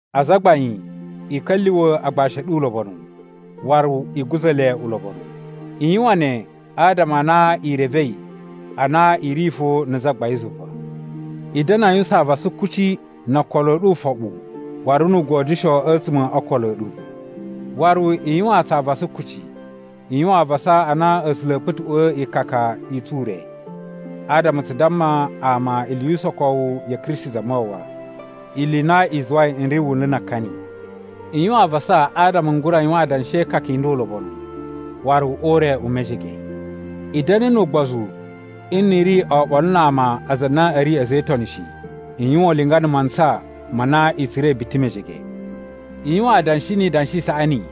Azagbain, i ka̱lyuwa̱ agbashi a̱ ɗu ulobonu, waru i guza̱ le ulobonu. I yuwan ne adama a na i revei a na i ri fo na̱ Zagbain zuva. I da̱na̱ a yuwusan avasa kuci no okolo a̱ ɗu ufoɓu waru nu ugodyusho a̱tsuma̱ o okolo a̱ ɗu. Waru i yuwaan tsu avasa kuci. I yuwan avasa a na A̱sula̱ a̱a̱ kpa̱tuꞌwa̱a̱ ikaka i tsu ure, adama tsu damma ama ili yu usokowu ya̱ Kristi Zamawawa, ili i na i zuwai n ri wunlu na akani. I yuwan avasa adama n gura yuwan adanshi e ikaka i nda ulobonu, waru o ure u mejege. I da̱na̱ nu ugbozu nni i ri oɓolo na ama aza a na a̱ ri a̱za̱ e Itoni shi. I yuwan ulinga na̱ mantsa ma na i tsura̱i biti mejege. I yuwan adanshi ni idanshi i saꞌani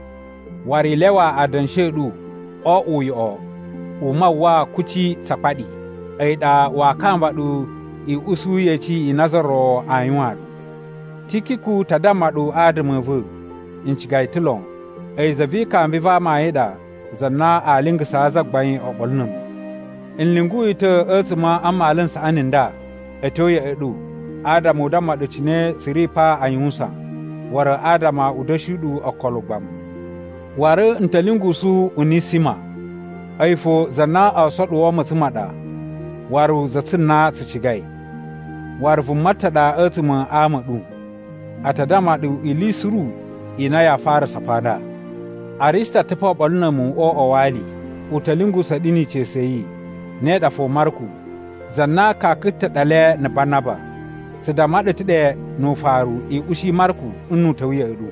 waru i lyawa adanshi a̱ ɗu o oꞌwo uyoꞌo u mawwa kuci tsa akpaɗi. A̱yi ɗa waa kamba ɗu i usu yeci i na za ro aa yuwan ɗu. Tikiku ta damma ɗu adama a̱ va̱. N ciga yi ta̱ lon. A̱yi za vi ikambi va amayun ɗa za na aa lingasaa Zagbain oɓolo na̱ a̱mu. N lyungu yi ta̱ a̱tsuma̱ a mmalu n saꞌani nda a̱ tyo ya̱ꞌa̱ ɗu adama u damma ɗu cine tsu ri pa a yuwusan, waru adama u da̱shi ɗu okolo ugbamu. Waru n ta̱ lyungusu Unisima. A̱yi fo za na oo soɗuwo matsan ma ɗa waru za tsu na tsu cigai. Waru vuma ta̱ ɗa a̱tsuma̱ a ama a̱ ɗu. A ta damma ɗu ili suru i na yaa farasa pa nda. Arista ta̱ pa oɓolo na̱ a̱mu o uꞌwa wa ali. U ta̱ lyungusa̱a̱ ɗu ni ica̱su ya̱ yi, ne ɗa fo Marku, za na kaka ta̱ ɗa le na̱ Banaba. Tsu damma ɗu ta̱ ɗe nu ufaru i ushi Marku nnu u ta̱wa̱ ya̱ꞌa̱ ɗu.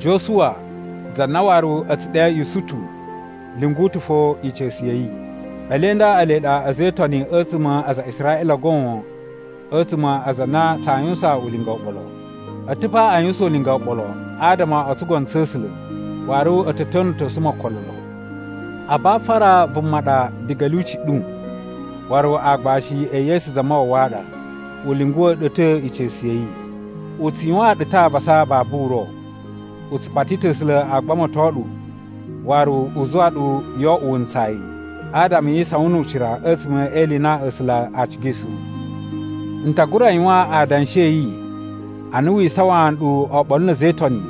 Josuwa za na waru a̱ tsu ɗe Yusutu, lyungu ta̱ fo ica̱su ya̱ yi. Ele nda ele ɗa a̱za̱ e Itoni a̱tsuma̱ aza a Israꞌila goon a̱tsuma̱ aza a na tsaa yuwusan ulinga oɓolo. A ta̱ pa a yuwusan ulinga oɓolo adama o tsugono tsa̱ A̱sula̱ waru a̱ ta̱ ta̱na̱tosu mu okolo lon. Abafara vuma ɗa diga a̱ lyuci ɗu, waru aagbashi e Yesu Zamawawa a ɗa. U lyunguwa̱ ɗu ta̱ ica̱su ya̱ yi. U tsu yuwaan ɗu ta̱ avasa babu uro. U tsu pati ta̱ A̱sula̱ a gbamato ɗu waru u zuwa ɗu yo oꞌwo wuntsayi, adama yi isawan nu ucira a̱tsuma̱ e ili i na A̱sula̱ a cigai suru. N ta gura yuwan adanshi a̱ yi ana wi isawaan nɗu oɓolo na̱ a̱za̱ e Itoni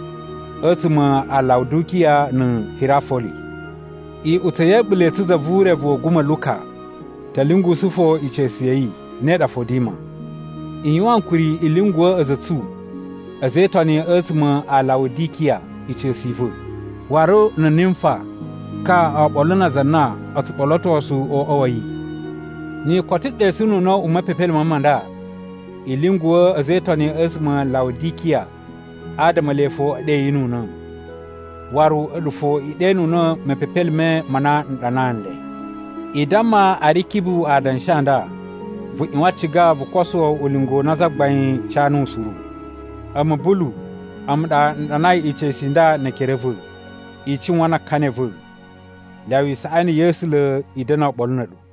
a̱tsuma̱ a Lawudikiya na̱ Hirafoli. Iꞌutsa̱ ya̱ a̱ɓula̱ i tsu za vu urevu wa̱ a̱guma̱ Luka ta̱ lyungusu fo ica̱su ya̱ yi, ne ɗa fo Dima. I yuwan ankuri i lyunguwa̱ a̱za̱ a̱ tsu a̱za̱ e Itoni a̱tsuma̱ a Lawudikiya ica̱su i va̱, waru na̱ Nimfa ka oɓolo na aza a na o tsu ɓolotosu o uꞌwa wa̱ yi. Ni i koto ɗesununa̱ u mepepelime ma nda, i lyunguwa̱ a̱za̱ e Itoni a̱tsuma̱ a Lawudikiya adama ele fo e ɗeyinuna̱. Waru a̱ɗu fo i ɗenuna̱ mepepelime ma na n ɗanaa nle. I damma Arikibu adanshi a nda, “Vu ꞌyuwan ciga vu koso ulinga u na Zagbain ca nuwu suru.” A̱mu, Bulu, a̱mu ɗa n ɗanai ica̱su i nda ne ekere a̱ va̱. I cuwan na akani a̱ va̱. Lyawa isaꞌani ya̱ A̱sula̱ i da̱na̱ oɓolo na̱ a̱ɗu.